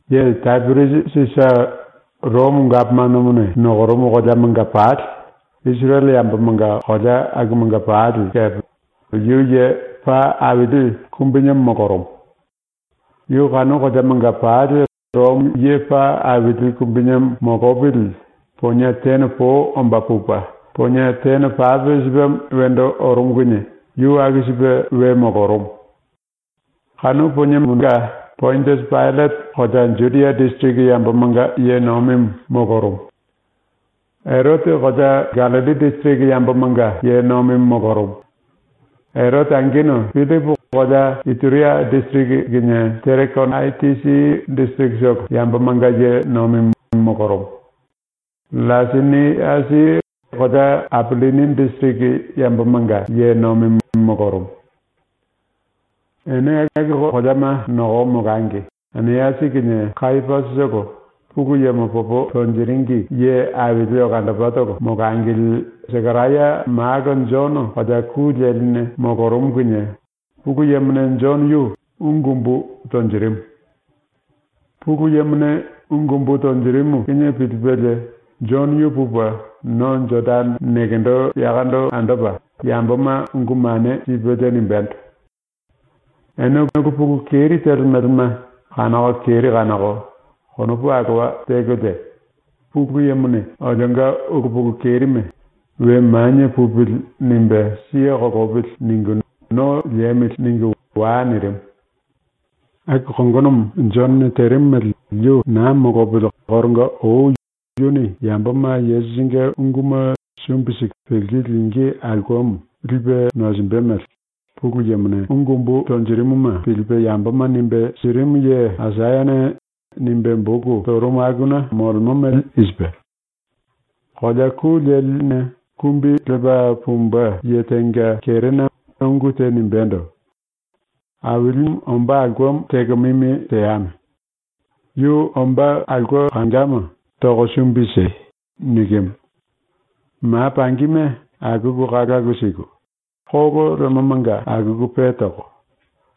Ye Tapiriasi Sisa, Romo gapomanomone nokorumu koleamanga pali, Isirele yambomanga kolea akumanga pali kepe yu ye paa aili kumbinemo molorumu. Yu kanu koleamanga pali Romo ye paa aili kumbinemo molopili ponie tene po omba pupe ponie tene pape sipemo wendo orumu kinie yu aku sipe we molorumu. Kanu poniemonga Pondiasi Paillate kolea Judia disiriki yambomanga ye nomimu molorumu; Erote kolea Gallilli disiriki yambomanga ye nomimu molorumu; Erote angenu Pillipu kolea Ituria disiriki kinie Terekonaitisi disirikitolo yambomanga ye nomimu molorumu; LLaiseniasi kolea Apillini disiriki yambomanga ye nomimu molorumu. Ene aku koleama nokoko molangi Anasi kinie Kayapasitolo Pulu Yemo popo tonjiringi ye aili olandopatolo molangili Sekaraya malo Jono kolea ku leline molorumu kinie Pulu Yemone Jono yu ungu umbu tonjirimu. Pulu Yemone ungu umbu tonjirimu kinie pilipelie Jono yu pupe no Jodane nekendo yakondo andopa yamboma ungu mane sipelie nimbendo: “Ene ulu pulu keri telemelema kanoko keri kanoko konopu alowa tekolie ‘Pulu Yemone olionga ulu pulu kerime ‘We manie pupili.’ nimbe siye kolopili.’ ningu ‘No liemili.’ ningu wai.” nirimu. ⸤Aku kongonomo Jonone terimu mele yu naa molopili koronga ou yuni yamboma Yesusinge unguma sumbi siku pilku lingí aulkemo lipe nosinjimbe mele⸥ Pulu Yemone ungu umbu tonjirimuma pilipe yamboma nimbe sirimu ye Aisayane nimbe boku torumu akuna molemo mele i sipe: “Kolea ku leline ⸤kumbi lepa pumbe⸥ ye tenga kerena ungu te nimbendo: “Ailimu ombá aulkemo teko mimi teame. Yu ombá aulke kangama toko sumbi siei.” nikimu. “Ma pangima akuku kalalu siku, kolo lemomanga akuku pe toko,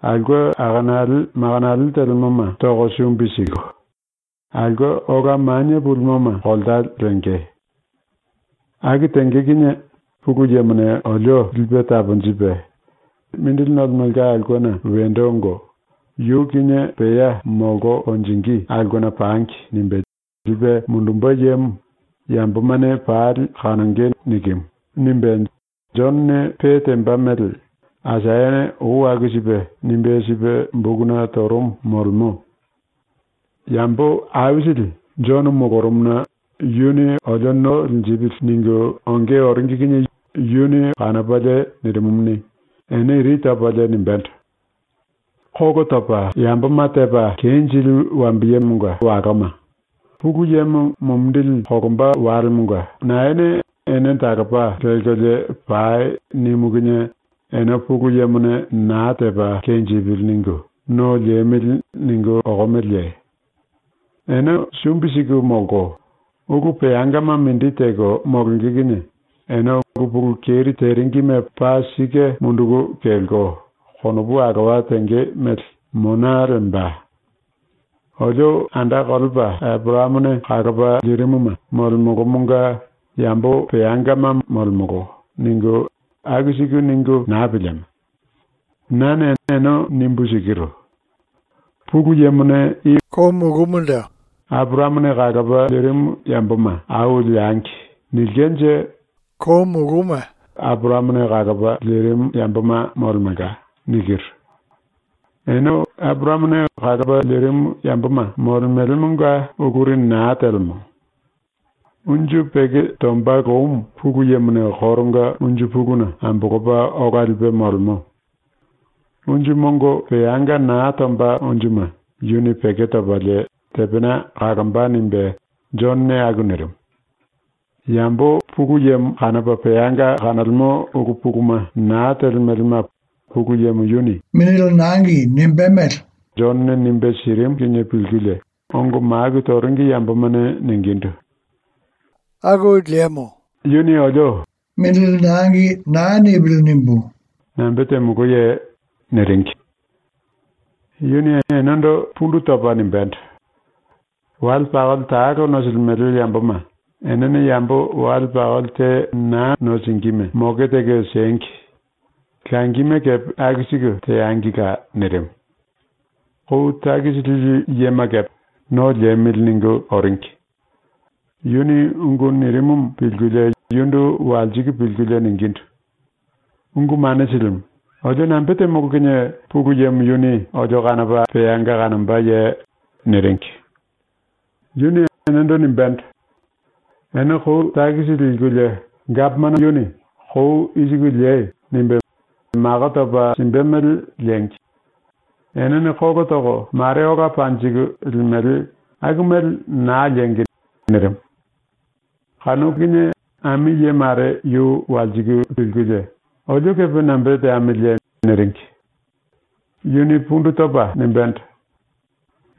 aulke anekale manekale telemoma toko sumbi siku, aulke ola manie pulimoma kolta lenge. Aku tenge kinie Pulu Yemone olio lipe taponjipe ‘Mindili nolemelka aulkena wendo ongo yu kinie pea molko konjingí aulkena pangi.’ nimbe lipe mundumbe yemo yambomane pali kanonge.” nikimu.” nimbe ⸤Jonone pe temba mele Aisayane ou aku sipe nimbe sipe bokuna torumu molemo.⸥ Yambo aisili Jono molorumuna ‘Yuni olio no linjipili.’ ningu onge oringi kinie yu kanopalie nirimumuni, ene iri topalie nimbendo: “Kolo topa yamboma tepa kenjili wambiyemonga waloma, Pulu Yemo mumindili kolomba walemonga naene “Ene talopa lelkolie pai.” nimu kinie ene ‘Pulu Yemone naa tepa kenjipili.’ ningu ‘No liemili.’ ningu okomeleye? Ene sumbi siku molko, ulu peangama mindi teko molonge kinie ene ulu pulu keri teringime paa sike munduku kelko konopu alowa tenge mele mona lemba. “Olio anda kolepa Eporayamone kalopa lirimuma molemolomonga yambo peangama molemolo.” ningu aku siku ningu naa pilieme. Nane ene nimbu sikiru: ‘Pulu Yemone i koumando “Eporayamone kalopa lirimu yamboma au leangi.” nilkenje kouma Eporayamone kalopa lirimu yamboma molemelka.’ nikiru. Ene Eporayamone kalopa lirimu yamboma molemelemonga uluri naa telemo. “Unju peko tomba loumu Pulu Yemone koronga unju puluna ambolopa ola lipe molemo. Unju mongo peanga naa tomba unjuma yuni peko topalie tepena kalomba.” nimbe Jonone aku nirimu. ⸤Yambo Pulu Yemo kanopa peanga kanolemo ulu puluma naa telemelema Pulu Yemo yuni mongo simbe mele Jonone nimbe sirimu kinie pilkulie⸥ ongo maku toringi yambomane ningindu: “ ⸤‘Yuni olio mongo naa sipili.’ nimbu⸥ nambe temoloye?” niringi. Yuni enendo pundu topa nimbendo: “Wale pakoli talo nosilimele yamboma enene yambo wale pakoli te naa nosingíme moke teko siengi. Langime kepe aku siku teangila.” nirimu. Kou takisi lili yema kepe ‘No liemili.’ ningu oringi. Yuni ungu nirimumu pilkulie yundu walsiku pilkulie ningindu: “Ungu Mane Silimu, olio nambe temolo kinie Pulu Yemo yuni olio kanopa peanga kanombaye?” niringi. Yuni enendo nimbendo: “Ene kou takisi likulie gapomano yuni “Kou i siku liei.” nimbe mako topa simbe mele liengi. Enene kolo toko mare ola panjiku limele aku mele naa liengi.” nirimu. Kanu kinie ami ye mare yu walsiku pilkulie, “Olio kepe nambe teamiliye?” niringi. Yuni pundu topa nimbendo: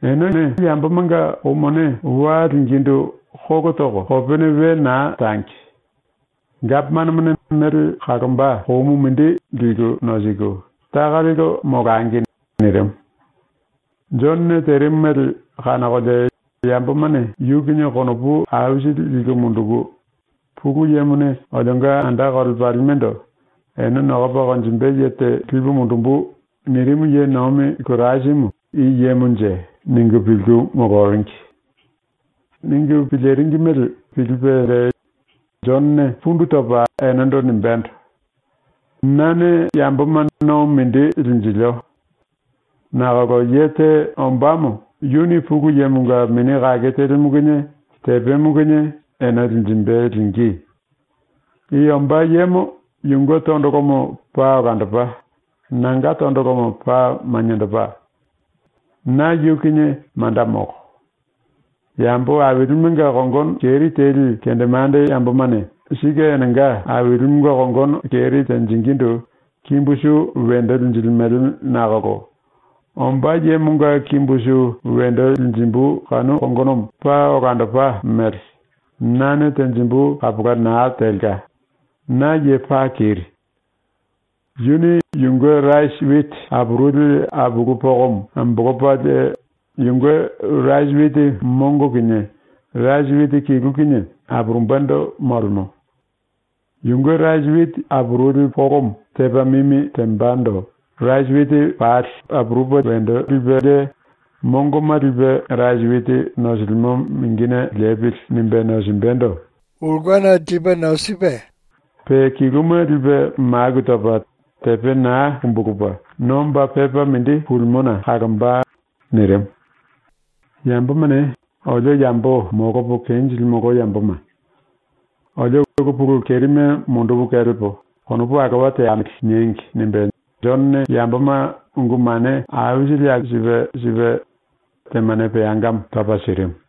“Enene yambomanga kou mone wa lingíndu kolo toko kopene we naa tangi. Gapomanomone mele kalomba koumu mindi liku nosiku, taka lelko molangi.” nirimu. Jonone terimu mele kanokolie yambomane yu kinie konopu aisili liku munduku, ‘Pulu Yemone olionga anda kolepalimendo “Ene nokopa konjimbe ye te lipu mundumbu.” nirimu ye nomi Kirasimu i yemonje?’ ningu pilku moloringi. Ningu piliringi mele pilipelie Jonone pundu topa enendo nimbendo: “Nane yamboma no mindi linjilio. Nakolo ye te ombámo yuni ⸤Pulu Yemonga⸥ Mini Kake Telimu kinie tepemo kinie ene linjimbe ⸤lingí⸥. I ombá yemo yunge tondolomo paa olandopa, nanga tondolomo paa maniendopa. Na yu kinie manda molo. ⸤Yambo ailimenga kongono keri teli kendemande yambomane sike enenga ailimenga kongono keri tenjingindu kimbu su wendo linjilimele nakolo⸥ ombá yemonga kimbu su wendo linjimbu kanu kongonomo paa olandopa mele nane tenjimbu kapola naa telka, na ye paa keri. Yuni yunge rasi witi apuruli apulu pokomo ambolopalie yunge rasi witi mongo kinie rasi witi kilu kinie apurumbendo molemo. Yunge rasi witi apuruli polomo tepa mimi tembando rasi witi pali ‘wendo liembo.’ nimbe apurupelie mongoma lipe rasi witi nosilimo mingine ‘Lepili.’ nimbe nosimbendo mingi topa, pe kiluma lipe maku topa tepe naa kumbulupe nomba pepa mindi pulimona kalomba.” nirimu. ‘Yambomane “Olio yambo molopo kenjilimolo yamboma. Olio ulu pulu kerime mundupu kelepo konopu alowa teamili.” niengi.’ nimbe Jonone yamboma ungu mane aisili aku sipe sipe, temane peangamo topa sirimu.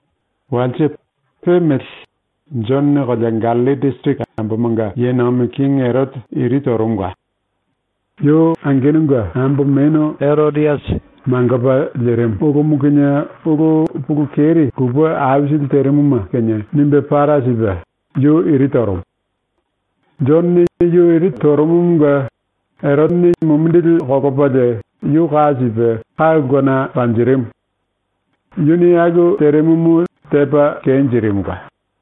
Walse, pe mele, Jonone kolea Gallilli disiriki yambomanga ye nomi kingi Erote iri torumula. Yu angenunge ambo menu Erodiasi ⸤mangopa lirimu⸥ ulumu kinie ulu pulu keri lupe aisili terimuma kinie nimbe para sipe yu iri torumu. Jonone yu iri torumumunge Erotene mumindili kolopalie yu ka sipe ka ulkena panjirimu. Yuni aku terimumu tepa kenjirimula.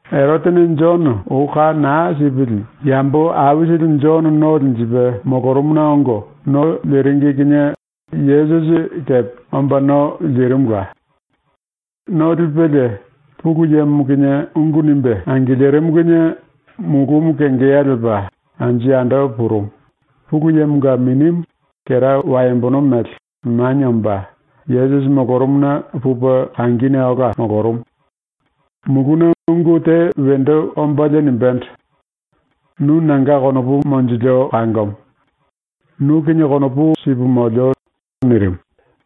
⸤Erotene Jono ou ka naa sipili⸥ yambo aisili Jono no linjipe molorumuna ongo no liringi kinie Yesusi kepe omba no lirimula. No lipelie Pulu Yemo kinie ungu nimbe angilirimu kinie mulumu kengeya lepa anju yando purumu, Pulu Yemonga Minimu, kera waembono mele, manie omba Yesusi molorumuna pupe kangine ola molorumu. Muluna ungu te wendo ombalie nimbendo: “Nu nanga konopu monjilio kangomo. Nu kinie konopu sipu molio.” nirimu.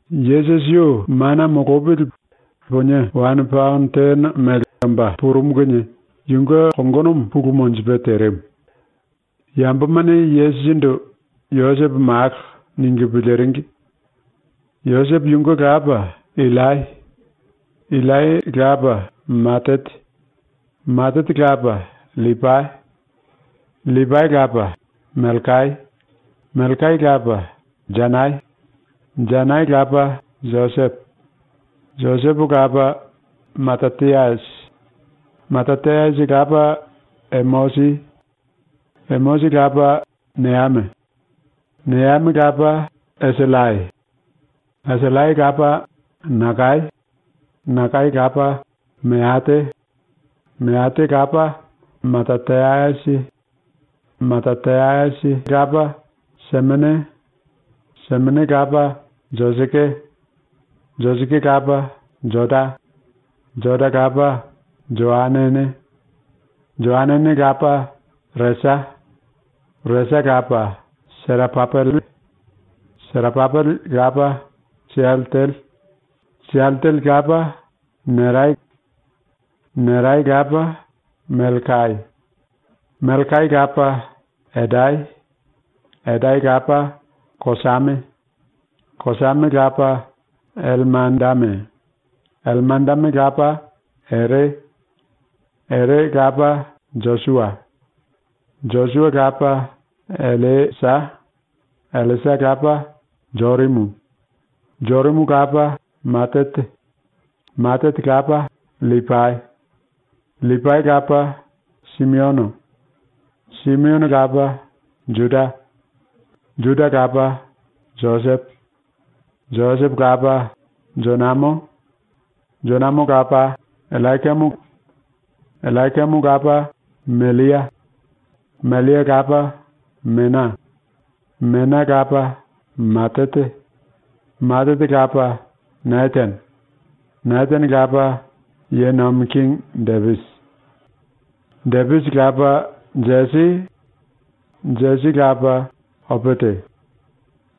Yesusi yu mana molopili ponie wane paono tene mele omba purumu kinie yunge kongonomo pulu monjipe terimu. Yambomane Yesusindu ‘Josepo malo.’ ningu piliringi. Josepo yunge lapa Illai. Illai lapa Matate. Matate lapa LLipai. LLipai lapa Melkai. Melkai lapa Janai. Janai lapa Josepo. Josepo lapa Matatayasi. Matatayasi lapa Emosi. Emosi lapa Neame. Neame lapa Esillai. Esillai lapa Nakai. Nakai lapa Meate. Meate lapa Matatayasi. Matatayasi lapa Semene. Semene lapa Joseke. Joseke lapa Joda. Joda lapa Joanane. Joanane lapa Resa. Resa lapa Serapapele. Serapapele lapa Sialtele. Sialtele lapa Nerai. Nerai lapa Melkai. Melkai lapa Edai. Edai lapa Kosame. Kosame lapa Ellemadame. Ellemadame lapa Ere. Ere lapa Josua. Josua lapa Elliesa. Elliesa lapa Jorimu. Jorimu lapa Matate. Matate lapa LLipai. LLipai lapa Simiono. Simiono lapa Juda. Juda lapa Josepo. Josepo lapa Jonamo. Jonamo lapa Ellayakimu. Ellayakimu lapa Mellia. Mellia lapa Mena. Mena lapa Matata. Matata lapa Netane. Netane lapa ⸤Ye Nomi Kingi⸥ Depisi. Depisi lapa Jesi. Jesi lapa Opete.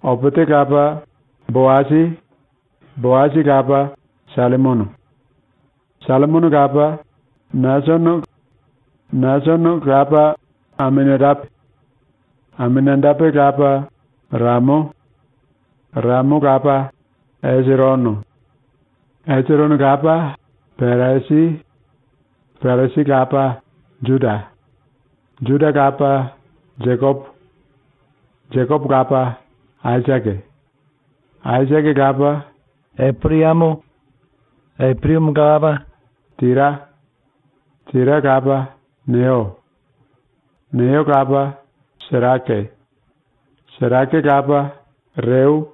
Opete lapa Boasi. Boasi lapa Sallimono. Sallimono lapa Nasono. Nasono lapa Aminadape. Aminadape lapa Ramo. Ramo lapa Esirono. Esirono lapa Peresi. Peresi lapa Juda. Juda lapa Jekopo. Jekopo lapa Aisake. Aisake lapa Eporayamo. Eporayamo lapa Tira. Tira lapa Neyo. Neyo lapa Serake. Serake lapa Reu.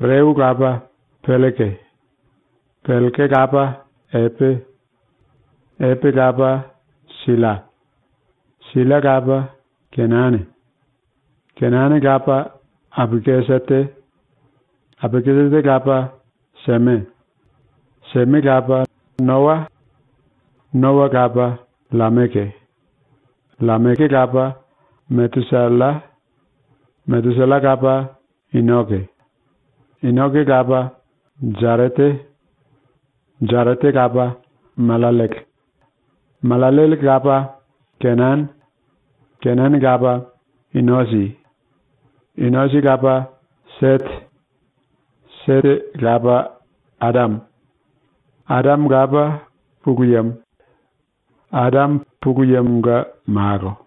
Reu lapa Pelleke. Pelleke lapa Epe. Epe lapa Silla. Silla lapa Kenane. Kenane lapa Apakisate. Apakisate lapa Seme. Seme lapa Noa. Noa lapa LLameke. LLameke lapa Metusalla. Metusalla lapa Inoke. Inoke lapa Jarete. Jarete lapa Mallallele. Mallallele lapa Kenane. Kenane lapa Inosi. Inosi lapa Sete. Sete lapa Adame. Adame lapa Pulu Yemo. Adame Pulu Yemonga malo.